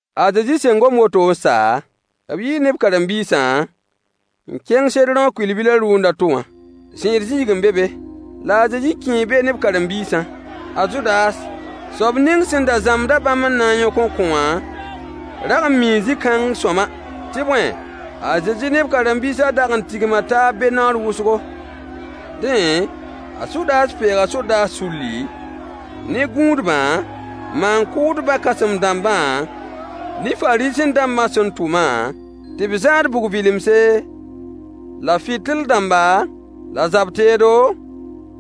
A Zezi sẽn gom woto n sa, b yii ne b karen-biisã n kẽng Sedrõ kʋɩl-bilã rʋʋnd a to wã. Zẽed zĩig n be be, la a Zezi kẽe be ne b karen-biisã. A Zudas, soab ning sẽn da zãmbd-a bãmb n na n yõk n kõ wã rag n mii zĩ-kãng sõama, tɩ bõe, a Zezi ne b karen-biisã dag n tigma taab be naoor wʋsgo. Dẽ, a Zudas peega sodaas sulli, ne gũudbã maan-kʋʋdbã kãsem-dãmbã ne Fariisẽ-dãmbã sẽn tʋmã, tɩ b zãad bug-vɩlemse, la fɩtɩl-dãmba, la zab-teedo,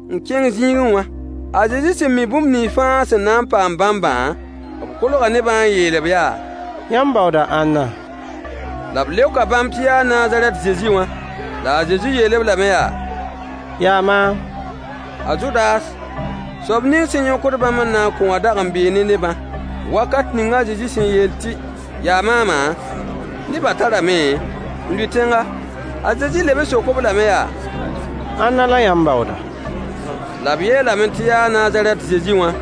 n kẽng zĩigẽ wã. A Zezi sẽn mi bũmb nins fãa sẽn na n paam bãmbã, b kolga nebã n yeel-b yaa: Yãmb baooda ãnna? La b leoka bãmb tɩ yaa Nazarɛt Zezi wã. La a Zezi yeel-b lame yaa: Yaa maam! A Zudas, soab ning sẽn yõkd bãmb n na n kõ wã dag n bee ne nebã. Wakat ning a Zezi sẽn yeel tɩ: Yaa maamã, nebã tarame n lʋɩ tẽnga. A Zezi leb n sok-b lame yaa: Ãnna la yãmb baooda? La b yeelame tɩ yaa Nazarɛt Zezi wã.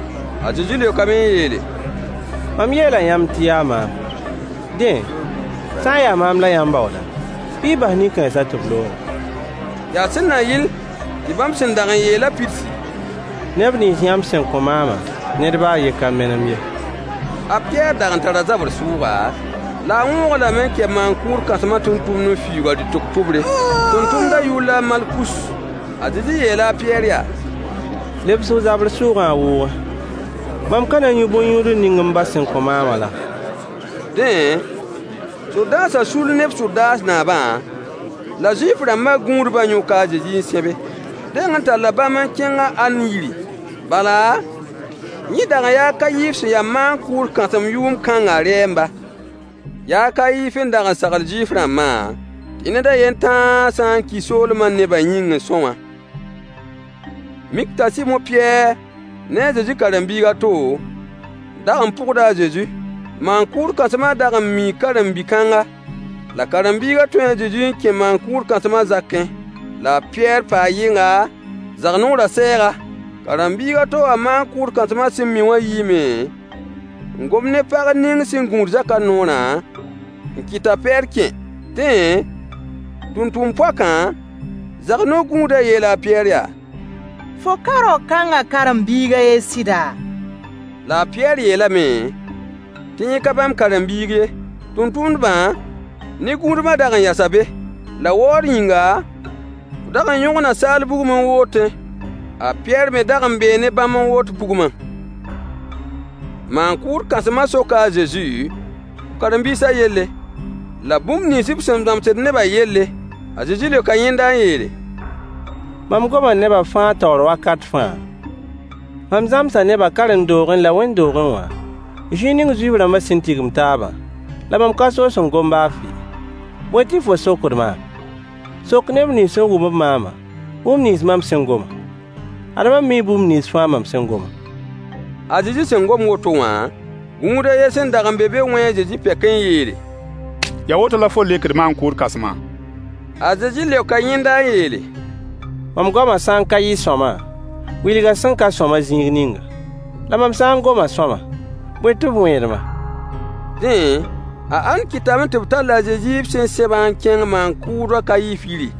A Zezi leokame n yeele: Mam yeela yãmb tɩ yaa maam. Dẽ, sã n yaa maam la yãmb baooda, bɩ y bas nin-kãensã tɩ b looge. Yaa sẽn na yɩl tɩ bãmb sẽn dag n yeelã pidsi: Neb nins yãmb sẽn kõ maamã, ned baa a yen ka menem ye. A Pɩyɛɛr dag n tara zabr sʋʋga, la a wõog-a lame n kɛ maan-kʋʋd kãsmã tʋmtʋmd n fiuug a rɩtg tʋbre. Tʋmtʋmdã yʋʋr la a Malkus. A Zezi yeela a Pɩyɛɛr yaa: Lebs f zabr sʋʋgã a wʋʋgẽ. Mam ka na n yũ bõn-yũudl ning m ba sẽn kõ maamã laa? Dẽ, sodaasã sull ne b sodaas naabã, la Zuif-rãmbã gũudbã yõka a Zezi n sẽbe. B deng n talla bãmb n kẽng a Ann yiri, bala, yẽ dag n yaa a Kayif sẽn ya maan-kʋʋd kãsem yʋʋm kãngã rɛɛmba. Yaa a Kayif n dag n sagl Zuif-rãmbã tɩ ned a yen tãa sã n ki soolmã nebã yĩng n são wã. Mik t'a Sɩmo Pɩyɛɛr ne a Zezi karen-biig a to dag n pʋgda a Zezi. Maan-kʋʋd kãsmã dag n mii karen-bi-kãnga, la karen-biiga tũu a Zezi n kẽ maan-kʋʋd kãsmã zakẽ, la a Pɩyɛɛr paa yɩnga, zag-noorã sɛɛga. Karen-biig a to wã maan-kʋʋd kãsmã sẽn mi wã yiime n gom ne pag ning sẽn gũud zakã noorã, n kɩt t'a Pɩyɛɛr kẽ. Dẽ, tʋmtʋmd poakã, zag-no-gũudã yeela a Pɩyɛɛr yaa: Fo ka rao-kãngã karen-biig a yen sɩda? La a Pɩyɛɛr yeelame tɩ yẽ ka bãmb karen-biig ye. Tʋmtʋmdbã ne gũudbã dag n yasa be. La waood yĩnga, b dag n yõgna saal bugum n wootẽ. A Pɩyɛɛr me dag n bee ne bãmb n woot bugmã. Maan-kʋʋd kãsmã soka a Zezi b karen-biisã yelle, la bũmb nins b sẽn zãmsd nebã yelle. A Zezi leoka yẽnda n yeele: Mam goma nebã fãa taoor wakat fãa, mam zãmsa nebã karen-doogẽ la wẽnd-doogẽ wã, zĩig ning Zuif-rãmbã sẽn tigimd taabã, la mam ka soos n gom baa fɩ. Bõe tɩ fo sokd maam? Sok neb nins sẽn wʋm-b maamã bũmb nins mam sẽn gomã. Ad mam mii bũmb nins fãa mam sẽn gomã. A Zezi sẽn gom woto wã, gũud a yen sẽn dag n be be wẽe a Zezi pɛk n yeele: Yaa woto la fo leokd maan-kʋʋd kãsmã? A Zezi leoka yẽnda n yeele: Mam goamã sã n ka yɩ sõama, wilg a sẽn ka sõama zĩig ninga. La mam sã n goma sõama, bõe tɩ f wẽed-ma? Dẽ, a Ann kɩtame tɩ b tall a Zezi b sẽn sẽbã n kẽng maan-kʋʋd a Kayif yiri.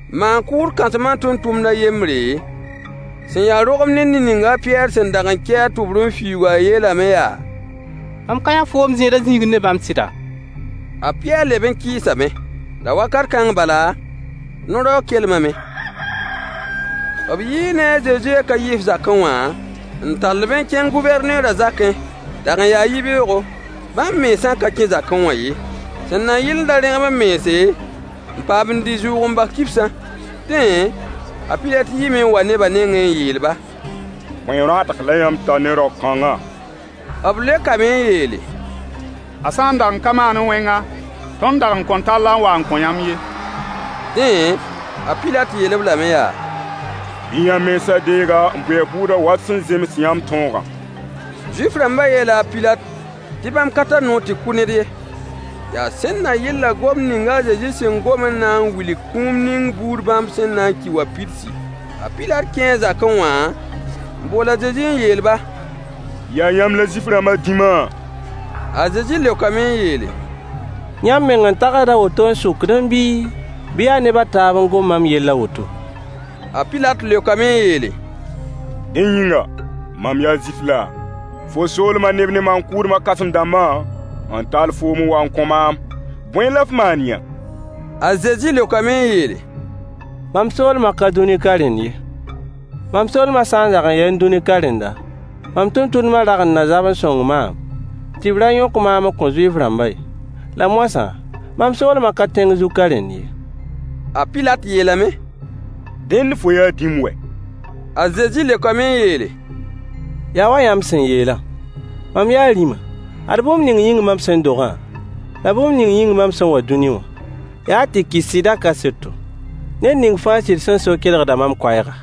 Maan-kʋʋd kãsmã tʋmtʋmd a yembre, sẽn ya rogem ne ned ning a Pɩyɛɛr sẽn dag n kɛ a tʋbr n fiuugã yeelame yaa: Mam ka yã foom zẽedã zĩigẽ ne bãmb sɩda? A Pɩyɛɛr leb n kɩɩsame. La wakat kãng bala, no-raoog kelmame. B yii ne a Zezi a Kayif zakẽ wã n tall-b n kẽng Gʋvɛrneerã zakẽ. Dag n yaa yibeoogo. Bãmb mensã ka kẽ zakẽ wã ye, sẽn na yɩl n da rẽgem b mense, n paam n dɩ zʋʋg-n-bas kibsã. Dẽ, a Pilat yiime n wa nebã nengẽ n yeel-ba: Bõe rõadg la yãmb tar ne rao-kãngã? B leokame n yeele: A sã n dag n ka maanẽ wẽnga, tõnd dag n kõn tall-a n wa n kõ yãmb ye. Dẽ, a Pilat yeel-b lame yaa: Bɩ yãmb mensã deeg-a n bʋ a bʋʋdã wa sẽn zems yãmb tõogã. Zuif-rãmbã yeela a Pilat tɩ bãmb ka tar noor tɩ kʋ ned ye. Yaa sẽn na yɩl la gomd ning a Zezi sẽn gom n na n wilg kũum ning buud bãmb sẽn na n ki wã pidsi. A Pilat kẽe a zakẽ wã n bool a Zezi n yeel-ba: Yaa yãmb la Zuif-rãmbã dĩma? A Zezi leokame n yeele: Yãmb meng n tags a woto n sokdẽ bii, bɩ yaa neb a taab n gom mam yell a woto? A Pilat leokame n yeele: Dẽ yĩnga, mam yaa Zuif laa? Fo soolmã neb ne maan-kʋʋdbã kãsem-dãmbã n tall foom n wa n kõ maam. Bõe la f maan-yã? A Zezi leokame n yeele: Mam soolmã ka dũni ka rẽnd ye. Mam soolmã sã n dag n yaẽ dũni ka rẽnda, mam tʋmtʋmdbã dag n na zab n sõng maam, tɩ b ra yõk maam n kõ Zuif-rãmbã ye. La moasã, mam soolmã ka tẽng zug ka rẽnd ye. A Pilat yeelame: Dẽnd fo yaa dĩm wɛ? A Zezi leokame n yeele: Ya wa yãmb sẽn yeelã, mam yaa rĩma. Ad bũmb ning yĩng mam sẽn dogã, la bũmb ning yĩng mam sẽn wa dũni wã: Yaa tɩ kɩs sɩdã kaseto. Ned ning fãa sɩd sẽn so kelgda mam koɛɛga.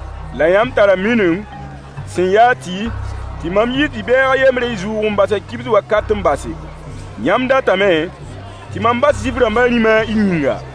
La yãmb tara mining sẽn yaa tɩ mam yiis bi-bɛɛg a yembr y zʋʋg-n-basã kibs wakat n base. Yãmb datame tɩ mam bas Zuif-rãmbã rĩmã y yĩnga?